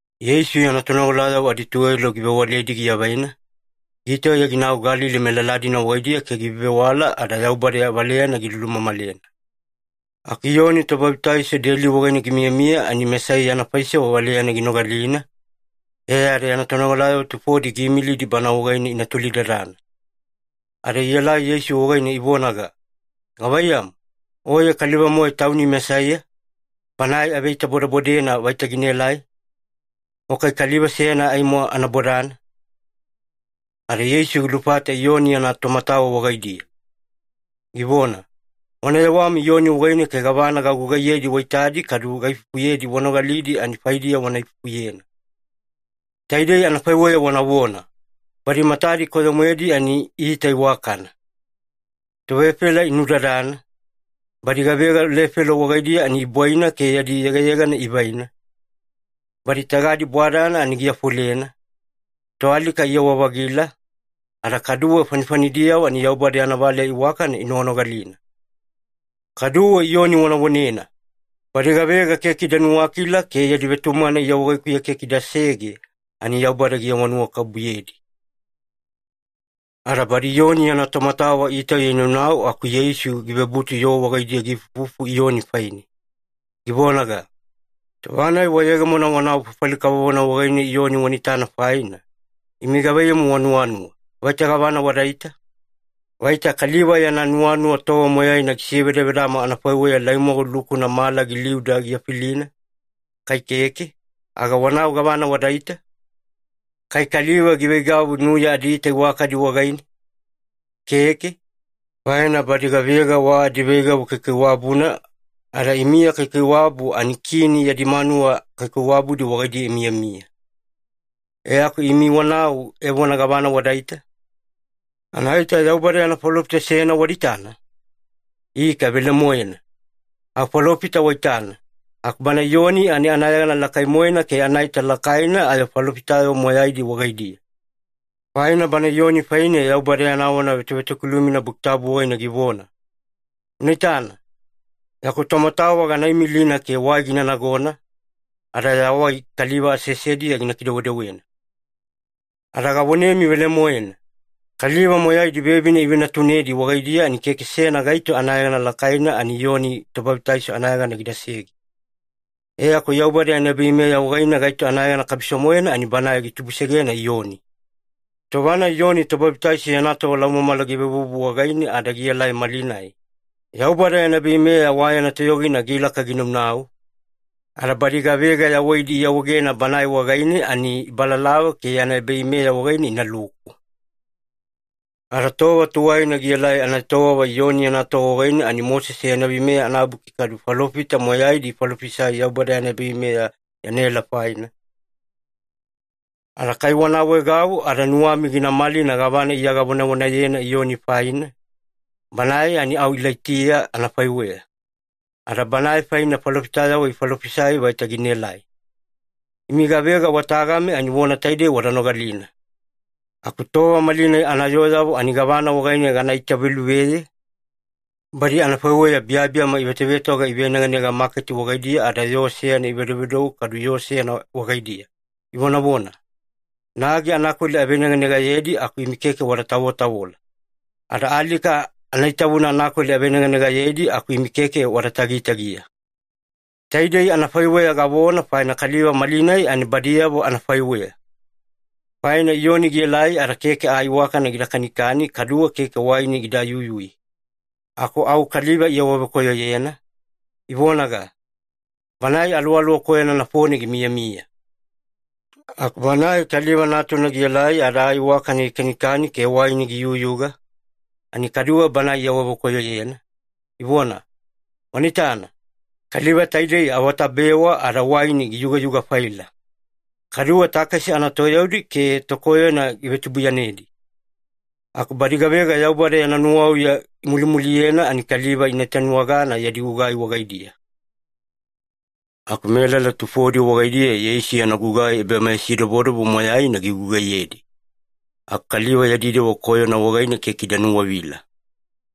Yeisu yana tonogalayavo adituwelo givewaledi giavaina, gitauya ginau Galili melala-dina wagaidiya ke givevewala ada Yaubada valeyana gilulumamalena. Aku Iyoni Tobabitaiso deli wagaine gimiyamiya ani Mesaiya yana faisewa valeyana ginogalina, e ada yana tonogalayavo tufodi giimilidi Bana wagaine ina tolidadana. Ada ielai Yeisu wagaine ivonaga, “Gavaiyamu, Oye kaliva-moe Tauni Mesaiya, Banae aveitabodebodena vaita ginaelai? O kai kaliva seyana aimo ana bodana?” Ada Yeisu gilufata Iyoni yana tomatawa wagaidiya, givona, “Wana yewami Iyoni wagaine ke gavana gagugaiyedi waitadi kadu gaifufuyedi wanogalidi, ani faidiya wana ifufuyena. Taidei anafaiweya wanavona, ‘Badi matadi koyo-moedi ani iita iwakana, tovefela inunudadana, badi gavega lefelo wagaidiya ani ibwaina ke yadi yegayegana ivaina, badi tagadi bwadana ani giafolena, toalika iyawa-vagila, ada kaduwe fanifanidiyavo ani Yaubada yana valeya iwakana inoganogalina.’ Kaduwe Iyoni wana vonena, ‘Badi gavega keke ida nuwakila ke yadi vetumagana Iya wagaikuya keke idasege, ani Yaubada giawanuwakabubuyedi.’” Ada badi Iyoni yana tomatawa itauya inaunau, aku Yeisu givebutu yoo wagaidiya giifufu Iyoni faine, givonaga, “Tova-nai wayegemona wanau fafali kavovona wagaine Iyoni wana itana faina, imi gavaiyamu wanuwanuwa, vaita gavana wadaita? Vaita kaliva yana nuwanuwa tova moyaina gisevedavedama anafaiweya laimwagu lukuna mala giliuda gifilina? Kai keke, aga wanau gavana wadaita? Kai kaliva giveigavu nuya adiita iwakadi wagaine? Keke, faina badi gavega wa adiveigavu kaikaiwabuna ada imiya kaikaiwabu ani kini yadi manuwa kaikaiwabudi wagaidiya imiyamiya. E aku imi wanau evona gavana wadaita? Anaita Yaubada yana falofita seyana wada itana? Ika velemoena, au falofita waitana, aku bana Iyoni ani anayegana lakai-moena ke anaita lakaina ayo falofitayavo moyaidi wagaidiya. Faina bana Iyoni faine Yaubada yana vona vetovetokilumina Buki Tabu wagaine givona, ‘Una itana, yaku tomatawa gana imilina ke wai gina nagona, ada ya wai kaliva aseasediya gina kidewedewena.’ Ada gavonemi velemoena, kaliva moyaidi vevine ivenatunedi wagaidiya, ani keke seyana gaito anayegana lakaina ani Iyoni Tobabitaiso anayegana gidasege. E aku Yaubada yana ebaveimeya wagaine, gaito anayegana kabiso-moena ani banae gitubusegena Iyoni. Tova-nai Iyoni Tobabitaiso yana tova laumamala givevuvu wagaine ada gielai malinai, Yaubada yana ebaveimeya wa yana toyogina gilaka ginaunau, ada badi gavega yawaidi iawaegena Banae wagaine, ani ibalalava ke yana ebaveimeya wagaine inaluku. Ada tova tuwaina gielai anaetowava Iyoni yana tova wagaine, ani Mosese yana Veimeya anabuki kadu falofita moyaidi ifalofisai Yaubada yana ebaveimeya yanaela faina. Ada kai wana awaegau ada nuwami gina malina gavana Iya gavonavonayena Iyoni faina, banae ani au Ilaitiya anafaiweya, ada banae faine falofitayavo ifalofisai vaita ginaelai. Imi gavega wa tagami ani vona taidei wada nogalina. “Aku tova malinai anayooyavo, ani gavana wagaine gana itaveluveye? Badi anafaiweya biyabiyama ivetovetoga iveneganega maketi wagaidiya, ada yoo seyana ivedovedou kadu yoo seyana wagaidiya, ivonavona, ‘Nagi anakweli aveneganegayedi aku imi keke wada tavotavola. Ada alika anaitavuna anakweli aveneganegayedi aku imi keke wada tagitagiya.’ Taidei anafaiweya gavona, faina kaliva malinai ani badiyavo anafaiweya. Faina Iyoni gielai ada keke aa iwakana gida kanikani kaduwe keke waini gida yuyui, aku au kaliva iawavekoyoyena, ivonaga, ‘Banae aluwaluwa koyona nafone gimiyamiya.’ Aku Banae Kaliva Natuna gielai ada aa iwakana gikanikani ke waini giyuyuga, ani kaduwe Banae iawavekoyoyena, ivona, ‘Wana itana, kaliva taidei awatabewa ada waini giyugayuga-faila. Kaduwe takesi anatoyaudi ke tokoyona givetubuiyanedi.’ Aku badi gavega Yaubada yana nuwauya imulimuliyena, ani kaliva ina itanuwagana yadi gugai wagaidiya.” Aku melala tufodi wagaidiya Yeisu yana gugai ebameyasidobodobo moyaina gigugaiyedi, aku kaliva yadi dewa koyona wagaine keke ida nuwavila.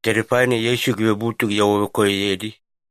Taidei faina Yeisu givebutu giawavekoyoyedi,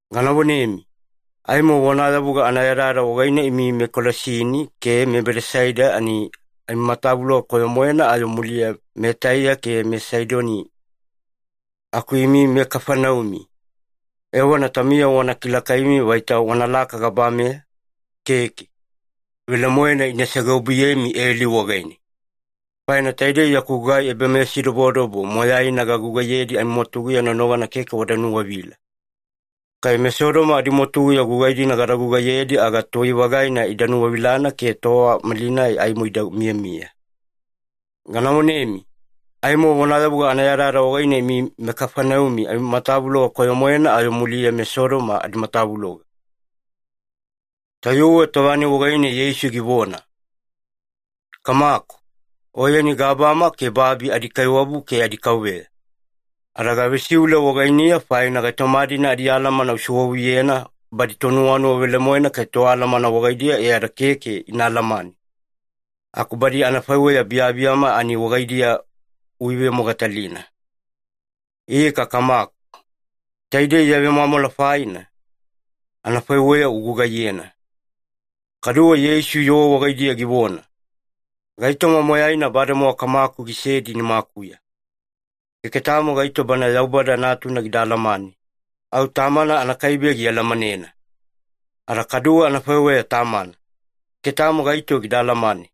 Gana vonemi, aimo vonayavuga anayadayada wagaine, imi meKolasini ke meBedasaida ani amimatavuloga koyo-moena ayo muliya meTaiya ke meSaidoni. Aku imi meKafaneumi, evona taumiyavo wana kilakaimi vaita wanalaka gabameya? Keke! Velemoena ina segeobuyemi eli wagaine. Faina taidei yaku gugai ebameyasidobodobo moyaina gagugaiyedi amimwatuguya nonogana keke wada nuwavila. Kai meSodoma adimwatuguya gugai-dina gada gugaiyedi, aga tuwai-vagaina ida nuwavilana ke tova malinai aimo ida miyamiya. Gana vonemi, aimo vonayavuga anayadayada wagaine, imi meKafaneumi amimatavuloga koyo-moena ayo muliya meSodoma adimatavuloga.” Tayuwe tova-nai wagaine Yeisu givona, “Kamaku, Oyeni gabama ke babi adiKaiwabu ke adiKauveya, ada gavesiule wagainiya faina gaitoma-dina adialamana usewavuyena badi tonuwanuwa velemoena ke toalamana wagaidiya e ada keke ina alamane, aku badi anafaiweya biyabiyama ani wagaidiya uivemogatalina. Ika Kamaku, taidei ya vemwamwala faina, anafaiweya ugugaiyena.” Kaduwe Yeisu yoo wagaidiya givona, “Gaitoma moyaina bademowa Kamaku gisedi nimakuya. Keke tamo gaito Banae Yaubada Natuna gida alamanena, au Tamana anakaibe gialamanena. Ada kaduwe anafaiweya Tamana, keke tamo gaito gida alamane.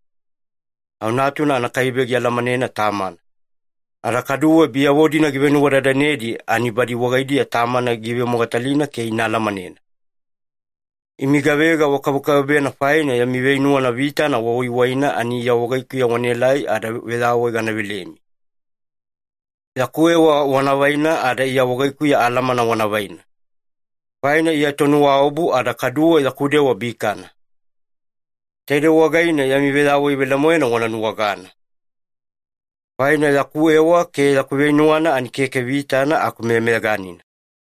Au Natuna anakaibe gialamanena Tamana, ada kaduwe biyavo-dina givenuwadadanedi, ani badi wagaidiya Tamana gina ivemogatalina ke ina alamanena.” “Imi gavega wakabekabebena faina yami veinuwana vitana wawaiwaina, ani Iya wagaikuya wanaelai ada veyawai gana velemi. Yaku ewa wana vaina ada Iya wagaikuya alamana wana vaina, faina Iya tonuwaobu ada kaduwe yaku dewa bikana. Taidei wagaine yami veyawai velemoena wana nuwagana. Faina yaku ewa ke yaku veinuwana ani keke vitana aku meyameyaganina.”